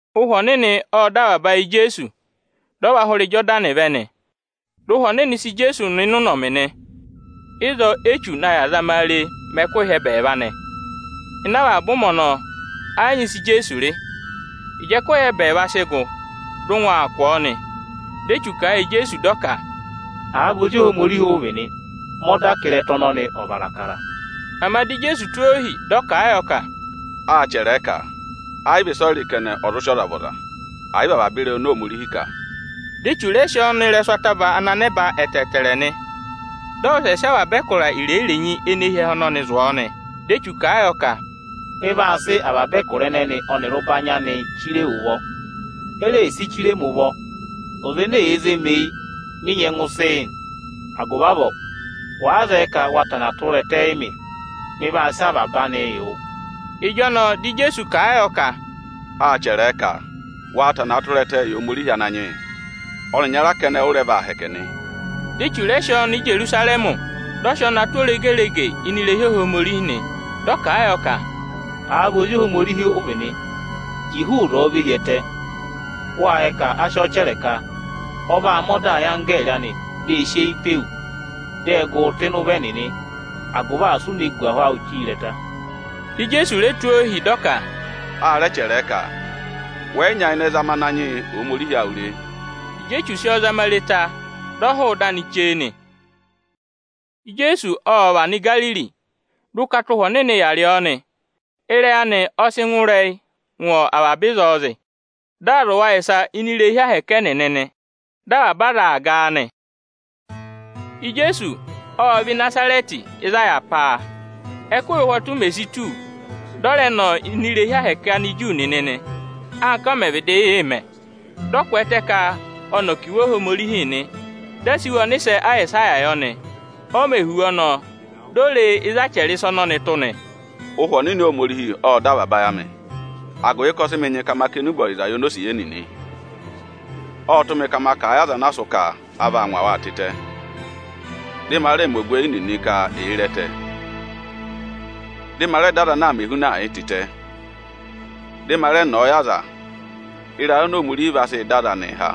Ụhwẹ Ọnịnị ộ dọ avaba ayị Ijeesu, dị ọ và hụrẹ Ijodani vẹ nị. Dị Ụhwẹ Ọnịnị sị Ijeesu nọ ịnị ụnọmị nị. Ịzọọ Échu na yà zama a re mẹ ẹkụhị ẹbẹẹva nị. Ịnị avaba ụmẹ ọnọọ, ẹ yị nyị ịsị Ijeesu rị. Ịjị ẹkụhị ẹbẹẹva sị gụ, dị ụngwẹ aa kụ̀ ọ nị. Dị Echu kà a yị Ijeesu dị ọ ka, “Àa vị Ozi Ohomorihi ụ vị nị, mẹ ọda ka ịrẹta ọnọnị ọ̀ vara akara!” Ama dị Ijeesu tụ́ ohi, dị ọ kà a yọ ka, “Â chẹrẹ ẹ ka: ‘Ẹ yị vị ịsọyịrị kẹnẹ, ọ zụ sị ọza vị ọza, ẹ̀ yị vị avaba ịrẹyị oni Ohomorihi kà!’” Dị Echu rẹ sị ọ nọ ịrẹsụ ataba ana nẹba ẹtẹẹtẹrẹ nị. Dị ọ wụsẹ sị avaba ẹkụra irenyi-irenyi ene hi ẹhẹ ọnọnị zụ̀ ọọ nị. Dị Echu kà a yọ ka, “Mị vaa sị avaba ẹkụra ẹnẹnị ọnịrị ụbanyị ẹnịnịị chire wu ụvọ. E reè si chire ẹmị ụvọ, ọza ene èe zé mi eyi, mị nyẹngụ sị yị. Agụvị avọọ, wàa zẹẹ ka wa tana tụra ẹtẹ yị mị, mị vaa sị avaba anịị yị wụ.” Ịjọnọọ dị Ijeesu kà a yọ ka, “Â chẹrẹ ẹ ka: ‘Waa tanaa tụra ẹtẹẹ yị Ohomorihi Ananyị yị, ọnị ịnyara kẹnẹ ụ rẹ vaa hẹkẹ nị.’” Dị Echu rẹ sị ọọ nọ Ijerusarẹmị, dị ọ sị ọọ na tụ́ oregerege ini irehi Ohomorihi nị. Dị ọ kà a yọ ka, “Àa vị Ozi Ohomorihi ụ vị nị, ji hụụ ịzọọ ve hi ẹtẹ! Wâ yẹ ka a sị ọọ chẹrẹ ka: ‘Ọ vaa mẹ ọda yị anggẹẹrị anị dị ẹ̀ sị eyi pe wu. Dị ẹ gụ wụ rị ụvọ, agụvị asị u ne gù ahụ awụ chire ịrẹta.’” Dị Ijeesu re tụ́ ọ ohi, dị ọ ka, “A rẹ chẹrẹ ẹ ka: ‘Wẹ yị nyayịnẹ zama Ananyị yị Ohomorihi awụ re.’” Ịjị Echu sị ọ zama re ta, dị ọ hụụ ịdị anị chee nị. Ijeesu ộ và nọ Igariri, dị ụkata Ụhwẹ Ọnịnị yà rị ọọ nị. Ịrẹyị anị ọ sị ngụ ịrẹyị ngụ avaba ịzọọ zị. Dị aa zụ̀ wa ịsa ini irehi Ohomorihi ẹnịnị nị. Dị avaba aza aa ga a nị. Ijeesu ộ vẹ Ịnazarẹtị, ịzị a yà pá a. Ẹ́kụhị ụhwọtụ mè si tù, dị ọ rẹ nọ ini irehi Ohomorihi Aniju nịnị nị, anka ọ mẹ̀ vịdị yị mẹ. Dị ọ kwẹẹtẹ ka ọnị ọ̀ kà Iwe Ohomorihi nị. Â sị iwe ọnịsẹ Ayịsaya yọ. Ọ mẹ̀ hụ̀ iwe ọnọọ, di o re ịzị a chẹrẹ ịsa ọnọnị tụ́ nị: “Ụhwẹ Ọnịnị Ohomorihi ộ dọ avaba ayị amị, agụvị ka ọ sị mị nyị ka ma kà enube ọyịza yị onosiye nịnị. Ộ tụ́ mị ka ma kà a yị aza ana a sụ́ ka a vaa ngwa waa tịtẹ, dị ma rẹ mẹ ogweyi nịnị ka èe re ẹtẹ; dị ma rẹ dọ aza ana aa mẹ ehunaa yịị tịtẹ; ộ nyị mị ka ma rẹ nọ ọ yị aza ịrayị oni Ohomorihi vaa sị dọ aza anịị há.”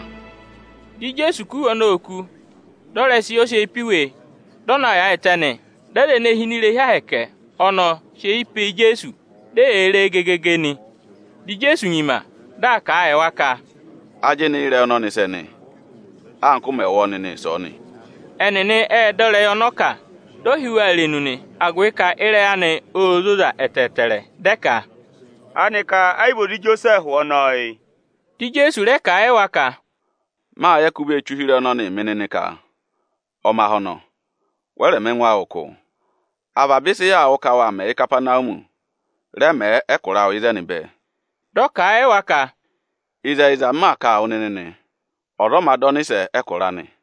Dị Ijeesu kú iwe ọnọọ oku, dị ọ rẹ sị yị ọza ana sị eyi pe iwe, dị ọ na yaayịtẹ nị. Dị aza ene hi ini irehi Ohomorihi ọnọọ sị eyi pe Ijeesu, di eyee re e gegege nị. Dị Ijeesu nyima, dị aa kà a yị wa ka, “Ajịnị ị́rẹyị ọnọọ sẹ nị, anka ụ mẹ̀ wụ́ ọọ nịnị ịsọọnị.” Ẹnịnị ệ dọ ivenu ịrẹyị ọnị ọ kà, di o hí wa irenu nị, agụvị ka ịrẹyị anị ô zoza ẹtẹẹtẹrẹ. Dị ẹ ka, “Aanịka ẹ yị vị ozi Ijosẹẹhụ ọnọọ yị?” Dị Ijeesu rẹ kà a yị wa ka, “Mâ yẹ ka u vee che ụhịrẹyị ọnọnịị mị nịnị ka: ‘Omahọnọ, wẹ rẹ̀ mẹ ẹngụ awụ ụkụụ! Avaba ịsị yaa wụ́ ka wâ mẹ Ìkapanawumi, rẹ mẹẹ ẹkụra awụ ịzẹnị bẹẹ!’” Dị ọ kà a yị wa ka, “Ịzẹyịza, m maa kà a wụ nịnị nị, ọza ọ mā dọ ọnịsẹ ẹkụra anị.”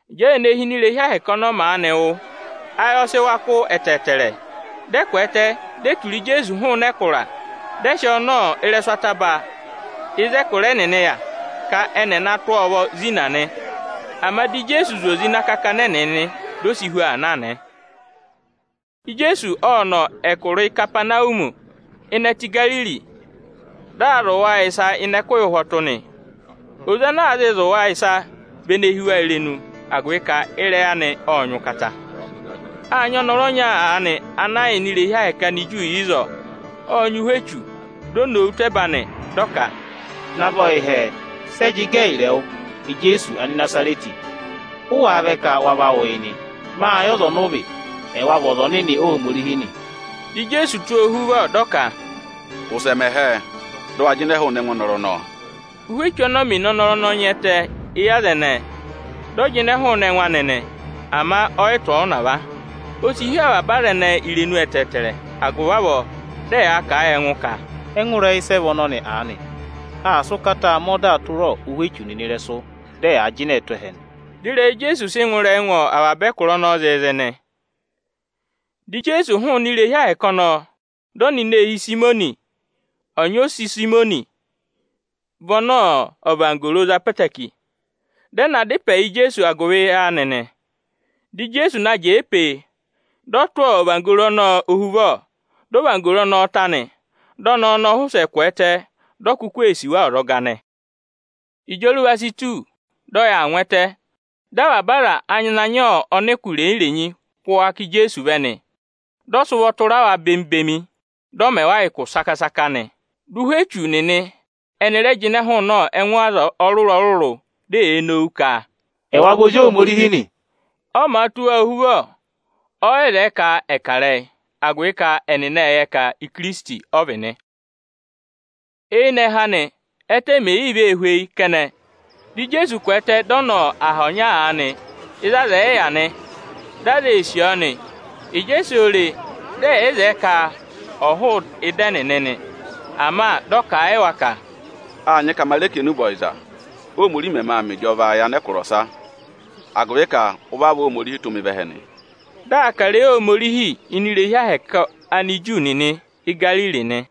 Ịjị aza ene hi ini irehi Ohomorihi ọnọọ maanị wụ́, ayị ọ sị wa kụ́ ẹtẹẹtẹrẹ. Dị ẹ kwẹẹtẹ, di e tura Ijeesu hụụnị ẹkụra, dị ẹ sị ọọ nọ ịrẹsụ ataba ana a dà ẹkụra ẹnịnị tụ, ka ẹnị ẹ̀ na tụ̀ ọ ụvọ zina nị. Ama di Ijeesu zị oze ịnị akakana ẹnịnị, di o si hu aa na nị. Ijeesu ộ nọ ẹkụra Ikapanawumi ịnị ẹtẹ Igariri. Dị aa zụ̀ wa ịsa ịnị ẹkụhị ụhwọtụ nị. Oze ana aa zịị zụ̀ wa ịsa vị ene hí wa irenu, agụvị ka ịrẹyị anị ộ nyị ụkata. Â nyị ọnọrụ ọnya aanị ana yà ini irehi Ohomorihi Aniju ịzọọ, ộ nyị ụhwẹ echu. Di o nowu tụ́ ẹba, dị ọ ka, “Navọ yị hẹẹ, sị ẹ jị gẹ ẹyịrị ẹwụ, Ijeesu Anịnazarẹtị? Ụ wáá vẹ ka wa va wụ yị nị? Mâ yẹ ọza ọnị ụ vị, ẹwa vị Ọza Ọnịnị Ohomorihi nị.” Dị Ijeesu tụ́ ọ ohuvọ, dị ọ ka, “Wụsẹ mẹ hẹẹ, dị ụ wa jịnẹ hụụnị ẹngụ ọnọrụ ọnọọ!” Ụ́hwẹ echu ọnọọ mè ne ọnọrụ ọnọọ nya ẹtẹ éyi aza ẹnẹẹ, dị ọ jịnẹ hụụnị ẹngụ anị nị, ama ọ yị tụ̀ ọ ụnava. O si hí avaba aza ẹnẹẹ irenu ẹtẹẹtẹrẹ, agụvị avọọ dị ẹ yaa kà a yị ẹngụ ka, “Ẹngụ ịrẹyị sẹ vị ọnọnị aanị? Aa sị ụkataa mẹ ọdaa tụra ụhwẹ echu nịnị ịrẹsụ, dị ẹ yaa jịnẹẹ tụ́ ẹhẹ nị!” Dị ịrẹyị Ijeesu sị ngụ ịrẹyị ngụ avaba ẹkụra ọnọọ zịịzị nị. Dị Ijeesu hụụnị irehi Ohomorihi ọnọọ, dị ọ nọ ini eehi Ịsayịmọnị nị. Ọnyị ose Ịsayịmọnị vị ọnị ọvanggoro za ẹtẹẹtẹrẹ, dị ẹ na dá ịpẹ yị Ijeesu agụvị anị nị. Dị Ijeesu na jẹẹ pee, dị ọ tụ́ ọvanggoro ọnọọ ohuvọ, dị ọvanggoro ọnọọ ta nị. Dị ọnẹẹ ọnọọ wụsẹ kwẹẹtẹ, di o kuku ee sì wa ọzọga nị. Ịjị oruva si tù, dị ọyị aa naa ngụ ẹtẹ, dị avaba aza ana nyị ọnịkụ irenyi-irenyi kụ́ wa ká Ijeesu vẹ nị. Dị ọ sị ụvọ tụra wa bemi-bemi, dị ọ mẹ wa ụkụ saka-saka nị. Dị ụhwẹ echu nịnị ẹnị rẹ jịnẹ hụụnị ẹngụ ọza ọrụrụ-ọrụrụ, di eyee nowu ka, “Ẹwa vị Ozi Ohomorihi nị!” Ọ màa tụ́ wa ohuvọ, ọ yị zẹẹ ka ẹ̀ kà ịrẹyị, agụvị ka ẹnịnị ệ yẹ ka Ikirisiti ọ vị nị. Eyinẹhẹ anị, ẹ́tẹ mèe yii vee hweyi kẹnẹ, dị Ijeesu kwẹẹtẹ, dị ọ nọ aha ọnya aanị ịzị aza ẹ̀ yị yà nị. Dị aza ee sì ọọ nị. Ịjị e si oo re, dị ẹ yị zẹẹ ka ọ̀ hụụ ịdị ẹnịnị nị. Ama dị ọ kà a yị wa ka, “Â nyị ka ma rẹ kà enube ọyịza, Óhomorihi mẹmẹ aa mẹ ịjọva yị anẹkụra ọsa; agụvị ka ụvị avọọ Óhomorihi tụ́ mị vẹ ẹhẹ nị.” Di aa kà ịrẹyị Ohomorihi ini irehi ahẹkẹ Aniju nịnị Ígariri nị.